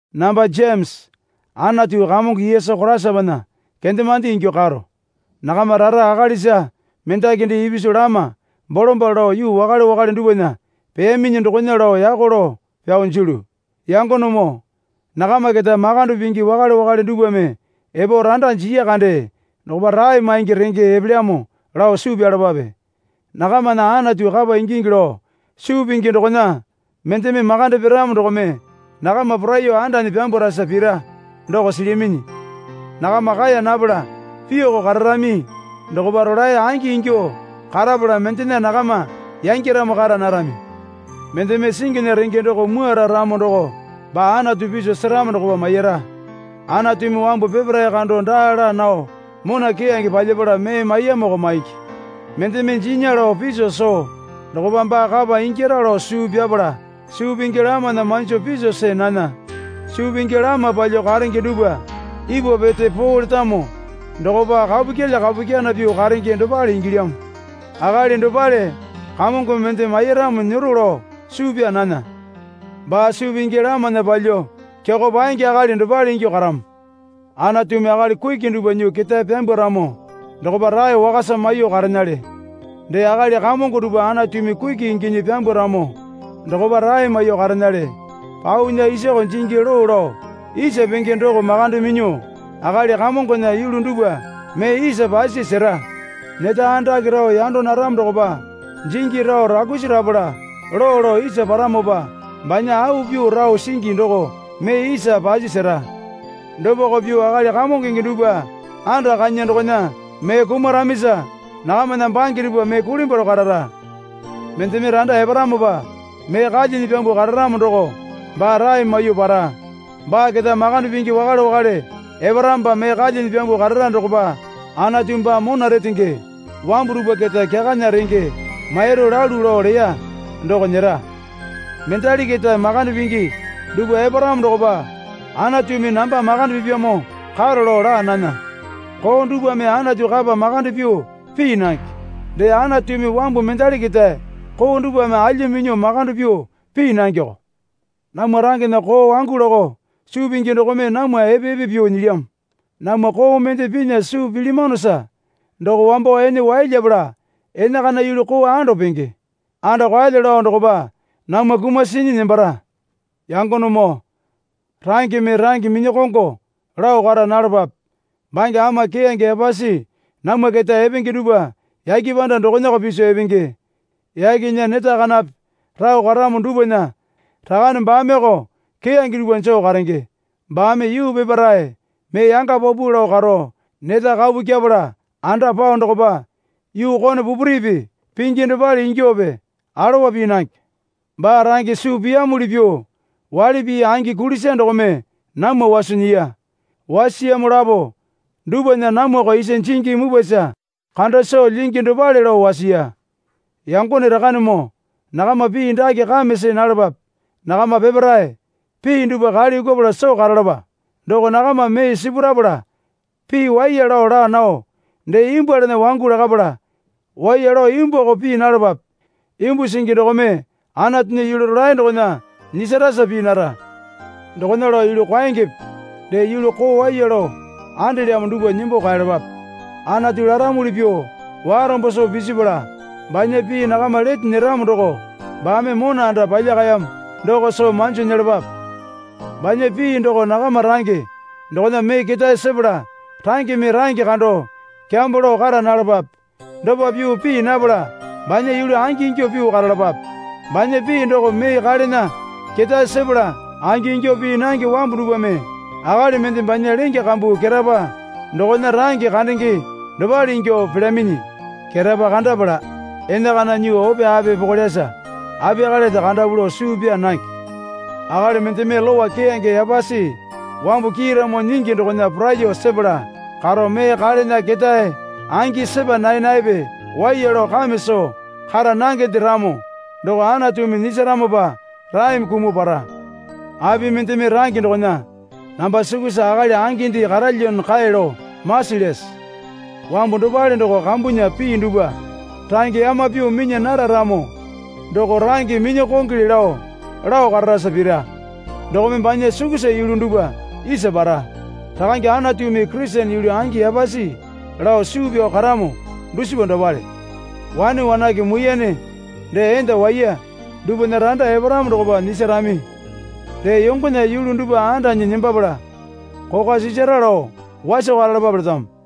Namba Jemesa Anatu Kamongo Yesu Koraisapana kendemande ingyuo karo. Nakama rara akalisa mendaki dee ipisu lama bolombalo lao yuu wakale wakale dupwana peyaminyi dokona lao yako lao pyao jilyu. Yangonemoo, nakama keta makande pingi wakale wakale dupwame epo randa jiya kande dokopa rae maingi renge epelyamo lao suu pyalapape. Nakamana Anatu kapa ingingi lao suu pingi dokona mendeme makande piramo dokome nakama poraiyuo andanyi pyambwarasa pira doko silyaminyi. Nakama kaeya napala pyuoko kararami dokopa rolae angi ingyuo karapala mendena nakama yangyaramo kara narami. Mendeme singinya renge doko mwuara ramo doko baa Anatu piso seramo dokopa maira. Anatumi wambu peparae kando daa laa nao mona keyange palyapala mee maiyamoko maingi. Mendeme jinya lao piso soo dokopa baa kapa ingyara lao suu pyapala, suu pingi lamana manjo piso see nana. Suu pingi lama palyuo karenge dupwa ipwa pete poo letamo dokopa kapu kyilya kapu kyana pyuo karenge dopale ingilyamo. Akali dopale Kamongome mende mairamo nyero lao suu pyaa nana. Baa suu pingi lamana palyuo kyakao paenge akali dopale ingyuo karamo. Anatumi akali kuki dupwa nyuo ketae pyambwaramo dokopa rae wakasa maiyuo karenale. Dee akali kamongo dupwa Anatumi kuki inginyi pyambwaramo dokopa rae maiyuo karenale. Paunya isoko jingi loo lao isa penge doko makande minyuo akali kamongona yulu dupwa mee isa pasi sera. Neta andake rao yando naramo dokopa jingi rao rakusi rapala loo lao isa paramopa banya au pyuo rao singi doko mee isa pasi sera. Dopako pyuo akali kamongonge dupwa anda kanya dokona mee kumaramisa nakamana bange dupwa mee kulimbwaro karara. Mendeme randa eparamopa mee kalyinyi pyambuo kararamo doko baa rae maiyuo para. Baa keta makande pingi wakale wakale eparamopa mee kalyinyi pyambuo karara dokopa Anatumi baa mona retenge wambu dupwa keta kyakana renge mairu lalu lao leya doko nyera. Mendali keta makande pingi dupwa eparamo dokopa Anatumi namba makande pipyamo karo lao laa nana. Koo dupwame Anatu kapa makande pyuo pii nange. Dee Anatumi wambu mendali keta koo dupwame alya minyuo makande pyuo pii nangeoko. Namwa rangena koo wangu lakao suu pingi dokome namwa epe epe pyuo nyilyamo. Namwa koo mende pinya suu pilyamanosa doko wambo ene wai lyepala enakana yulu koo ando penge. Ando kaelyo lao dokopa namwa kumasinyi nembara. Yangonemoo rangeme range minyakongo lao kara nalapape. Bange ama keyange yapasi namwa keta epenge dupwa yake panda dokonako piso epenge. Yakena neta kanape rao karamo dupwana Rakane baameoko keyange dupwa joo karenge. Baame yuu peparae mee yanga paupau lao karo neta kapu kyepala anda pao dokopa yuu kone pupuripi pingi dopale ingyuope alowa pii nange. Baa range suu piyamuli pyuo waili pii angi kulisa dokome namwa waso nyiya. Wasiyamo lapo dupwana namwako isa jingi mupwasa kanda soo lyingi dopale lao wasiya. Yangone Rakanemoo nakama pii dake kame see nalapape. Nakama peparae pii dupwa kale yukupala soo karalapa. Doko nakama mee sipurapala pii waiya lao laa nao, dee imbwualana wangu lakapala waiya lao imbwuako pii nalapape. Imbu singi dokome Anatunya yulu rolae dokona nyisarasa pii nara. Dokona lao yulu kwaengepe dee yulu koo waiya lao andelyamo dupwa nembo kaeyalapape. Anatu laramuli pyuo warombo soo pisipala, banya pii nakama lete nyeramo doko baame mona anda palyakayamo doko soo manjo nyelapapae. Banya pii doko nakama range dokona mee ketae sepala rangeme range kando kyambo lao kara nalapape. Dopa pyuo pii napala banya yulu angingyuo pyuo karalapape. Banya pii doko mee kalena ketae sepala angingyuo pii nange wambu dupwame akali mende banya lenge kambu ketapa dokona range kandenge dopale ingyuo pelyaminyi. Ketapa kandapala enakana nyuo ope api pokolyasa apiyakalende kandapu lao suu pyaa nange. Akali mendeme lowa keyange yapasi wambu kiiramo nyingi dokona poraiyuo sepala karo mee kalena ketae angi sepa nae naepe, waiya lao kame soo kara nangende ramo doko Anatumi nyisaramopa raeme kumuo para. Api mendeme range dokona namba sukusa akali anginde karalyamo kae lao masilyase? Wambu dopale doko kambunya pii dupwa range yama pyuo minya nara ramo doko range minya kongole lao lao kararasa pira. Dokome banya sukusa yulu dupwa isa para. Rakange Anatumi Kurisene yulu angi yapasi lao suu pyao karamo dusipa dopale. Wane wanake muiyane dee enda waiya dupwana randa eparamo dokopa nyisarami. Dee yongona yulu dupwa andanyi nembapala kokwa sisara lao waso karalapape letamo.